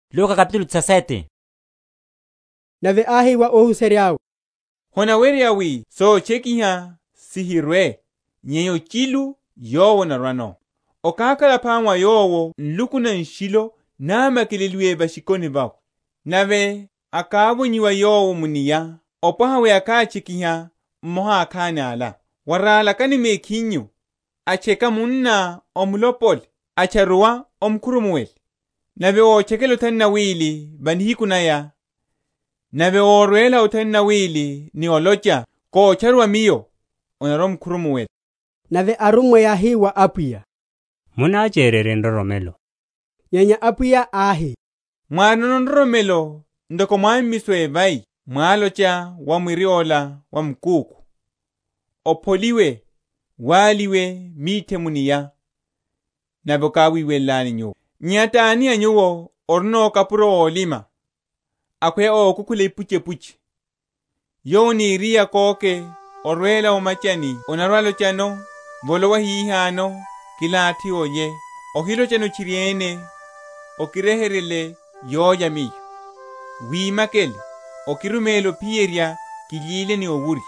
Sotchekiha, makhurumuwelo, ni ikuru sa malamulo. Nave áhi wa óhuserya’we, Honaweryeya wi sotchekiha sihirwe; nyenya ochilu yowo anarwano. Okákhala phama wa yowo nluku na nshilo náma?-?keleleiye va’shikoni vawe, nave akávonyiwa yowo mu’nia, opwaha wi akátchekiha mmoha a akhani ala. Waralakani mekhinyu; atcheka munná omulopole; atcharuwa, omukhurumuwele. Nave ótchekela othanu na wili va nihiku naya, nave órwela othanu na wili ni olocha, Kotcharuwa miyo; onarwa‐omukhurumuwela. Nave arummwa yáhi wa Apwiya, Munachererye nroromelo. Nyenya Apwiya áhi, Mwárino nroromelo ntoko mwámmiso a evai, mwalocha wa mwiri ola wa mukúkhu, Opholiwe, waliwe mithe mu’nia; nave okáhiwelela nyuwo. Nyenya tani a nyuwo orino kapuro ólima, akhweya ókukhula ipuchepuche, yowo aniriye akóke orwela o’machani anarwa‐alochano, Volowa hihano kilathi olye; ohilochano tchiriene, Okiryeheryele yólya miyo, wimakele, okiruméle ophiyerya kilyile ni owurya,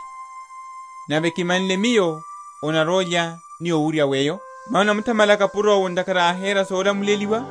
nave kimanle miyo onarwa‐olya ni owurya weyo? Mano anamuthamala kapuro’wo ntakhara áhera solamuleliwa?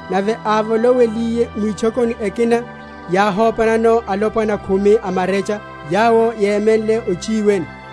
Nave ávolowiliye mwitchokoni ekina, yáhopanano alopwana khumi a marecha, yawo yémenle ochiwene;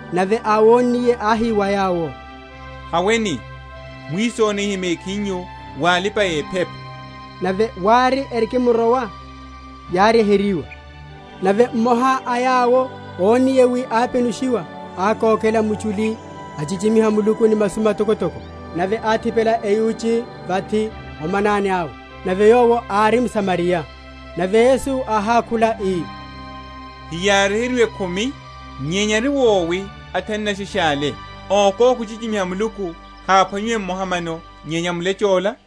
Nave áwonniye áhi wa yawo, Haweni, mwisonihe mekhinyu wa alipa‐ephepa. Nave wári, erikimrowa, yáryeheryiwa. Nave mmoha a yawo, ónniye wi ápenushiwa ákokela muchuli, achichimiha Muluku ni masu matokotoko, nave áthipela eyuchi vathi o manani awe, amuthamala Yowo; nave yowo ári mSamariya. Nave Yesu áhákhula ii, Heyáryeheryiwe khumi? nyenya ari wowi athanu nasheshe ale? Ókóka ochichimiha Muluku haphwanyiwe mmoha mano, nyenya mulecho’la?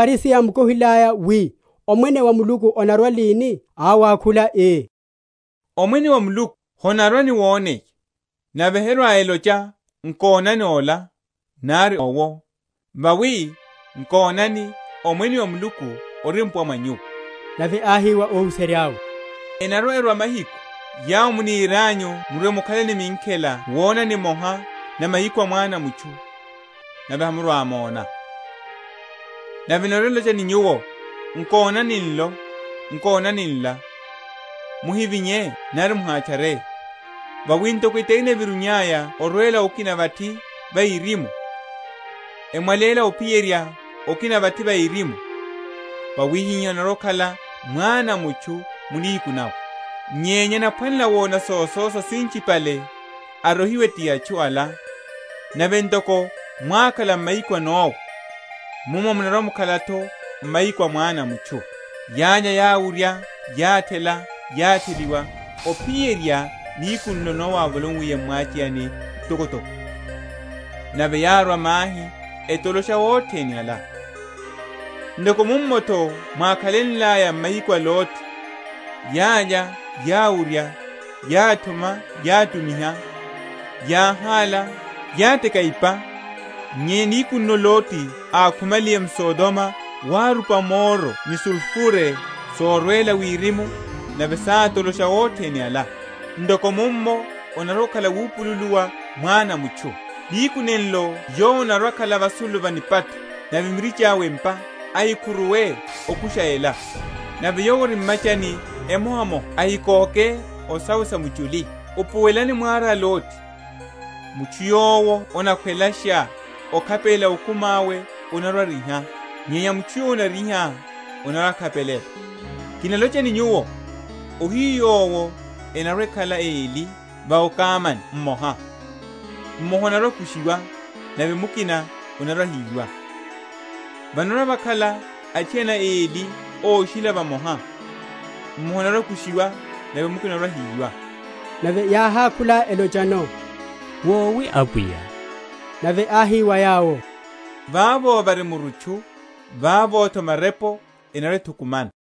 Nave aFarisi yámukohilaya wi, Omwene wa Muluku onarwa lini, áwakhula, ii, Omwene wa Muluku honarwa ni woneya: nave herwa‐elocha, Nkonani ola, nari owo! Vawi, nkonani, Omwene wa Muluku ori mpuwa mwa nyuwo. Nave áhi wa óhuserya’we, Enarwa‐erwa mahiku, yawo munirianyu murwe‐mukhale ni minkhela wona nimoha na mahiku a Mwana a mutchu, nave hamurwa‐mona. Nave enarwa‐elocha ni nyuwo, Nkonani nlo! nkonani nla! muhivinye nari muhatchare; vawi ntoko etari enaverunya orwela okina vathi va erimu, emwaléla ophiyerya okina vathi va erimu, wawihihá anarwa‐akhala Mwana a mutchu mu nihiku nawe. Nyenya anaphwanela wona sososa sinchipale arohiwe ti atchu ala. Nave ntoko mwákhala m’mahiku a Nowa, mummo munarwa‐mukhala’tho m’mahiku a Mwana a mutchu. Yálya, yáwurya, yáthela, yátheliwa, ophiyerya nihiku nlo Nowa ávolowiliye m’mwacheyani mtokotoko, nave yárwa mahi, etolosha othene ala. Ntoko mummo’tho mwákhalelaya m’mahiku a Loti; yálya, yáwurya, yáthuma, yátumiha, yáhála, yáteka ipa; nyenya nihiku nlo Loti ákhumaliye mSodomo wárupa moro ni sulfure sorwela wirimu, nave sátolosha othene ala; ntoko mummo onarwa‐okhala nihiku nawupululuwa Mwana a mutchu. Nihiku nenlo yowo anarwa‐akhala vasulu va nipatho, nave mirichi awe m’pa, ahikhuruwe okusha ela; nave yowo ori m’machani emohamoha ahikóke o sawe sa muchuli. Upuwelani mwara a Loti. Mutchu yowo anakhwelasha okhapelela okumi awe anarwa‐ariha, nyenya mutchu yowo anariha, anarwa‐akhapelela. Kinalocha ni nyuwo, Ohiyu yowo enarwa‐ekhala eli va okamani mmoha; mmoha anarwa‐akushiwa, nave mukina anarwa‐ahiyiwa. Vanarwa‐vakhala athiana eli óshila vamoha, mmoha anarwa‐akushiwa, nave mukina anarwa‐ahiyiwa. Nave yáhákhula elochano, Wowi Apwiya? Nave áhi wa yawo, Vavo vari murutchu, vavo’tho marepo enarwa‐ethukumana.